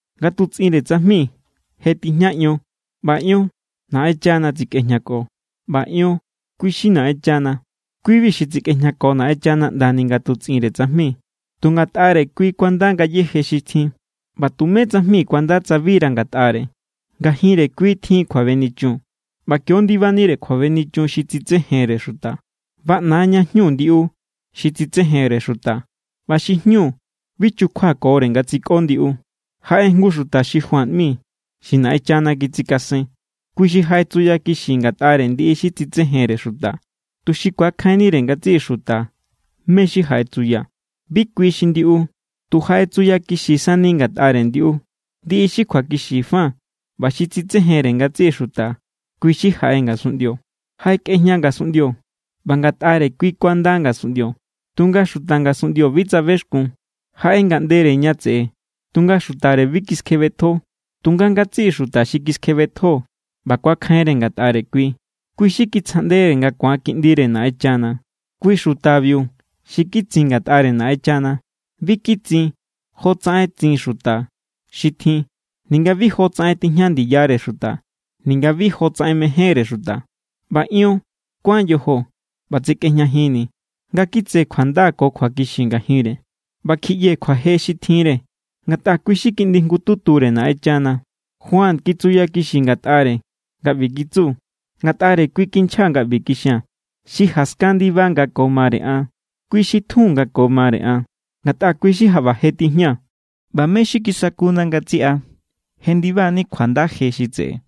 Nga tutsꞌinre tsajmi je tijña Ion, ꞌba Ion Naꞌenchana tsekꞌejñako, ꞌba Ion kui= xi Naꞌenchana. Kui=bi xi tsekꞌejñako Naꞌenchana ꞌndani nga tutsꞌinre tsajmi. Tu ngatꞌare kui kuanda ngayéje xi tjin, ꞌba tumé tsajmi kuanda tsa bira ngatꞌare. Ngajinre kui tjin kjuabenichun, ꞌba kio ndibanire kjuabenichun xi tsitsejenre xuta. Baꞌna= ña jñu ndiꞌu xi tsitsejenre xuta, ꞌba xi jñu bi chukjuakore nga tsikꞌo ndiꞌu. Jaꞌe jngu xuta xi Juan ꞌmi xi Naꞌenchana kitsikasen. Kui xi jaꞌetsuyakixi ngatꞌare ndiꞌi xi tsitsejenre xuta, tuxi ku̱akjainnire ngatsiꞌi xuta mé= xi jaꞌetsuya. Bi kui xi ndiꞌu. Tu jaꞌetsuyakixi sani ngatꞌare ndiꞌu. Ndiꞌi xi kjuakixi fa ꞌba xi tsitsejenre ngatsiꞌi xuta, kui= xi jaꞌe ngasunꞌndio. Jaꞌekꞌejña ngasunꞌndio ꞌba ngatꞌare= kui kuanda ngasunꞌndio, tunga xuta ngasunꞌndio bi tsabexkun. Jaꞌe ngaꞌndere ña tseꞌe, tunga xutare bi kiskjebetjo. Tunga ngatsiꞌi xuta xi kiskjebetjo ꞌba kuakjainre ngatꞌare kui, kui xi kitsjaꞌndere nga ku̱an kiꞌndire Naꞌenchana. Kui xutabiu xi kitsin ngatꞌare Naꞌenchana. Bi kitsin jotsaꞌen tsin xuta xi tjin, ninga bi jotsaꞌen tijña ndiyare xuta, ninga bi jotsaꞌen mejénre xuta. ꞌBa Ion kuán yojo ꞌba tsekꞌejñajinni̱ nga kitse kjuanda ko kjuakixi ngajinre. ꞌBa kjiꞌyee̱ kjuaje xi tjinre, ngatꞌa kui= xi Kiꞌndi jngututure Naꞌenchana. Juan kitsuyakixi ngatꞌare nga ꞌbi kitsu: “Ngatꞌare= kui kinchjaa̱ nga kixia̱n: Xi jaskan ndiba nga ko mare an, kui xi tjun nga ko mare an, ngatꞌa kui= xi jaꞌba je tijña.” ꞌBa mé= xi kisakuna ngatsiꞌa jendiba=ni kjuanda je xi tseꞌe,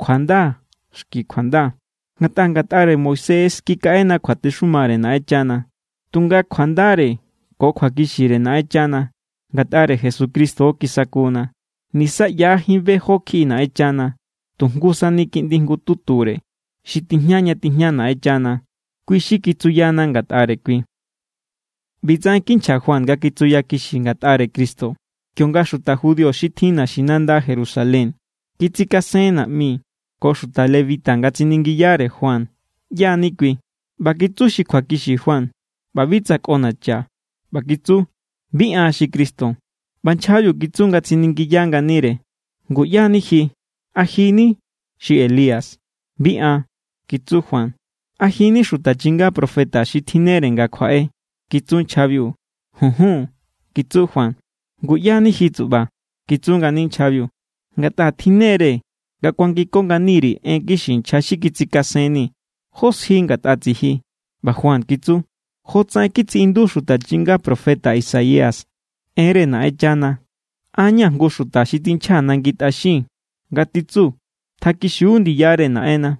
kjuanda xki kjuanda. Ngatꞌa ngatꞌare Moisés= kikaꞌena kjuatexumare Naꞌenchana, tunga kjuandare ko kjuakixire Naꞌenchana ngatꞌare Jesucristo= kisakuna. Nisa ꞌyajín be jó kjiꞌi Naꞌenchana. Tu jngu sani Kiꞌndi jngututure, xi tijña ña tijña Naꞌenchana, kui= xi kitsuyana ngatꞌare kui. ꞌBi tsaꞌen kinchja Juan nga kitsuyakixi ngatꞌare Cristo, kionga xuta judío xi tjin naxinanda Jerusalén kitsikasen naꞌmi ko xuta lebita nga tsiningiyare Juan ꞌyá= ni kui. ꞌBa kitsu xi kjuakixi Juan ꞌba bi tsꞌonacha. ꞌBa kitsu: —Bi an xi Cristo. ꞌBa nchjabiu kitsu nga tsiningiya nganire: —¿Ngu ꞌyá= ni ji? ¿A ji= ni xi Elías? —Bi an —kitsu Juan. —¿A ji= ni xuta chinga profeta xi tjinnere nga kjuaꞌe? —kitsu nchjabiu. —Junjun —kitsu Juan. —¿Ngu ꞌyá= ni ji, tsuꞌba? —kitsu ngani nchjabiu—. Ngatꞌa tjinnere nga kuangiko ngani_ri̱ en kixi nchja xi kitsikasenni̱. ¿Jó sji ngatꞌa tsiji? ꞌBa Juan kitsu: —Jotsaꞌen kitsiꞌindu xuta chinga profeta Isaías enre Naꞌenchana: “An= ña̱ jngu xuta xi tinchja nangi tꞌaxin nga titsu: Tjakixiu ndiyare Naꞌenna.”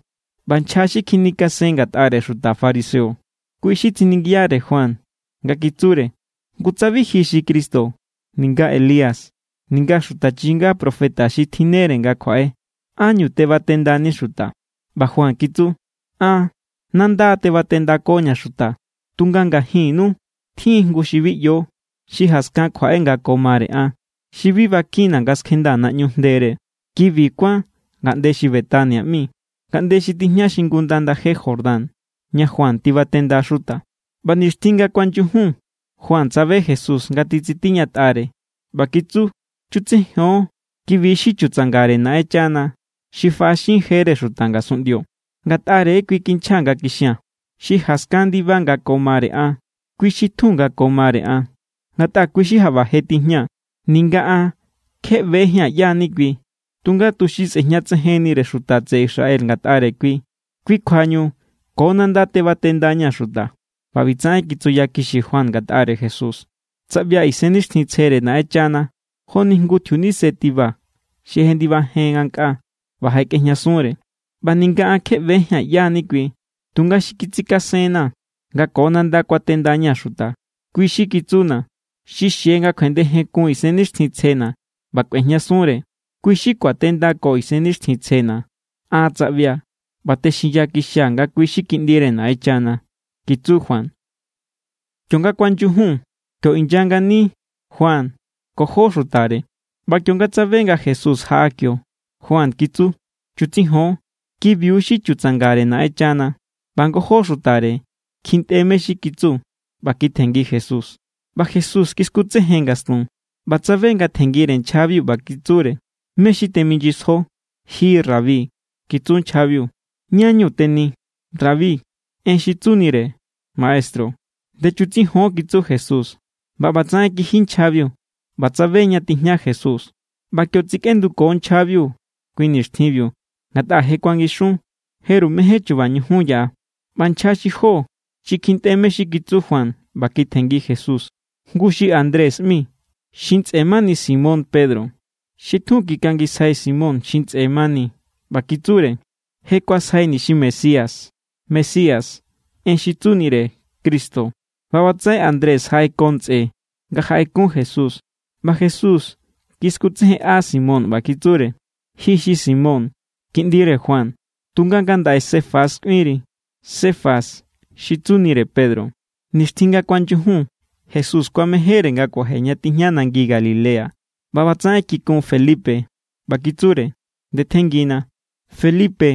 ꞌBa nchja xi kjinikasen ngatꞌare xuta fariseo, kui= xi tsiningiyare Juan nga kitsure: —Ngu tsa bi ji= xi Cristo, ninga Elías, ninga xuta chinga profeta xi tjinnere nga kjuaꞌe, ¿ánñu tebatendani xuta? ꞌBa Juan kitsu: —An nanda tebatendakoña̱ xuta. Tunga ngajinnu tjin= jngu xi bi ꞌyo, xi jaskan kjuaꞌe nga ko mare an xi bi bakinna̱ nga skjendaa̱ naꞌñu jndere. Kibi kuán ngaꞌnde xi Betania ꞌmi, ngaꞌnde xi tijña xingunda ndaje Jordán ña Juan tibatenda xuta. ꞌBa nixtjin nga kuanyujun Juan tsabe Jesús nga titsitiñatꞌare, ꞌba kitsu: —Chutsijon, kibi= xi chutsangare Naꞌenchana xi faꞌaxin jere xuta ngasunꞌndio. Ngatꞌare= kui kinchjaa̱ nga kixia̱n: “Xi jaskan ndiba nga ko mare an, kui xi tjun nga ko mare an, ngatꞌa kui= xi jaꞌba je tijña.” Ninga an kje ꞌbejía̱n ꞌyá= ni kui. Tunga tuxi sꞌe̱jñatsejennire xuta tseꞌe Israel ngatꞌare kui, kui kjuañu ko nanda tebatendaña̱ xuta. ꞌBa ꞌbitsaꞌen kitsuyakixi Juan ngatꞌare Jesús: —Tsaꞌbia̱ Isennixtjintsjere Naꞌenchana joni jngu tjiunise tiba xi jendibajen ngankꞌaa ꞌba jaꞌekꞌejñasunre. ꞌBa ninga an kje ꞌbejía̱n ꞌyá= ni kui. Tunga xi kitsikasenna̱ nga ko nanda kuatendaña̱ xuta, kui= xi kitsuna̱: “Xi xie nga kjuendejenkun Isennixtjintsjena̱ ꞌba kꞌuejñasunre, kui= xi kuatenda xuta ko Isennixtjintsjena̱.” An tsaꞌbia̱ ꞌba texinyakixia̱ nga kui= xi Kiꞌndire Naꞌenchana —kitsu Juan. Kionga kuanyujun, kio inya ngani Juan ko jó xutare. ꞌBa kionga tsabe nga Jesús jaꞌa kio, Juan kitsu: —Chutsijon, kibiu= xi chutsangare Naꞌenchana. ꞌBa ngojó xutare kjintꞌe mé= xi kitsu ꞌba kitjenngi Jesús. ꞌBa Jesús kiskutsejen ngastun ꞌba tsabe nga tjenngire nchjabiu, ꞌba kitsure: —¿Mé= xi teminyisjo? —Ji rabi —kitsu nchjabiu—, ¿ñá=ñu teni? (Rabi, en xi tsunire: maestru.) —Ndechutsijon —kitsu Jesús. ꞌBa ꞌbatsaꞌen kiji nchjabiu ꞌba tsabe ña tijña Jesús. ꞌBa kio tsikꞌenduko nchjabiu kui nixtjinbiu, ngatꞌa je kuangixun. Jeru mején chuba ñujun yaꞌa. ꞌBa nchja xi jó xi kjintꞌe mé= xi kitsu Juan ꞌba kitjenngi Jesús, jngu xi Andrés ꞌmi, xi ntsꞌe mani Simón Pedro. Xi tjun kikangisjai Simón xi ntsꞌe mani ꞌba kitsure: —Je kuasjaini̱ xi Mesías. (Mesías, en xi tsunire: Cristo.) ꞌBa ꞌbatsaꞌen Andrés jaꞌeko ntsꞌe nga jaꞌekun Jesús, ꞌba Jesús kiskutsejenꞌa Simón ꞌba kitsure: —Ji xi Simón, kiꞌndire Juan. Tunga ngandaꞌe Cefas kꞌuinri. (Cefas, xi tsunire: Pedro.) Nixtjin nga kuanyujun Jesús kuamejénre nga kuaje ña tijña nangi Galilea ꞌba ꞌbatsaꞌen kikun Felipe. ꞌBa kitsure: —Ndetjenngina. Felipe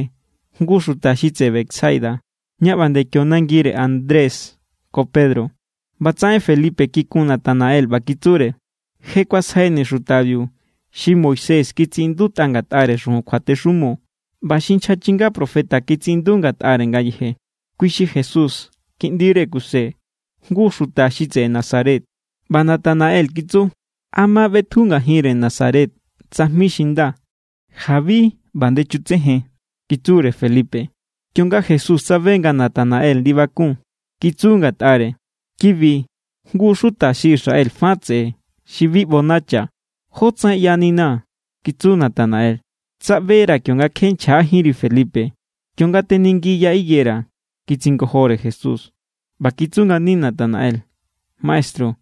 jngu= xuta xi tseꞌe Betsaida, ña ꞌba nde kio nangire Andrés ko Pedro. ꞌBatsaꞌen Felipe kikun Natanael, ꞌba kitsure: —Je kuasjaini̱ xutabiu xi Moisés kitsiꞌindutꞌa ngatꞌare xujun kjuatexumo ꞌba xi nchja chinga profeta kitsiꞌindu ngatꞌare ngayeje. Kui xi Jesús kiꞌndire Kuse, jngu xuta xi tseꞌe Nazaret. ꞌBa Natanael kitsu: —¿A ma ꞌbetju ngajinre Nazaret tsajmi xi nda? —Jabi ꞌba ndechutsejen —kitsure Felipe. Kionga Jesús tsabe nga Natanael ndibakun, kitsu ngatꞌare: —Kibi jngu= xuta xi Israel fa tseꞌe xi bi ꞌbonacha. —¿Jó tsaꞌen ꞌyaninaa̱? —kitsu Natanael. —Tsaꞌbera̱ kionga kje nchjajínri Felipe, kionga teningi ya higuera —kitsingojore Jesús. ꞌBa kitsu ngani Natanael: —Maestru,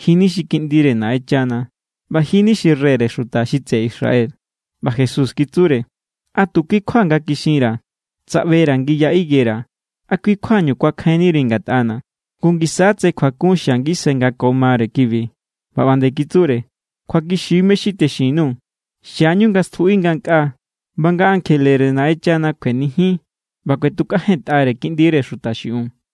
ji= ni xi Kiꞌndire Naꞌenchana ꞌba ji= ni xi reyre xuta xi tseꞌe Israel. ꞌBa Jesús kitsure: —¿A tu kui= kjua nga kixinra̱: “tsaꞌbera̱ ngi ya higuera”, a kui= kjuañu kuakjainniri ngatꞌana̱? Ngu ngisa= tse kjuakun xia ngisai nga ko mare kibi. ꞌBa ꞌba nde kitsure: —Kjuakixi= mé= xi texin_nuu̱. Xiañu nga stjuꞌi ngankꞌaa ꞌba nga ankjelere Naꞌenchana kuenijin ꞌba kꞌuetukꞌajentꞌare Kiꞌndire Xuta xiꞌiun.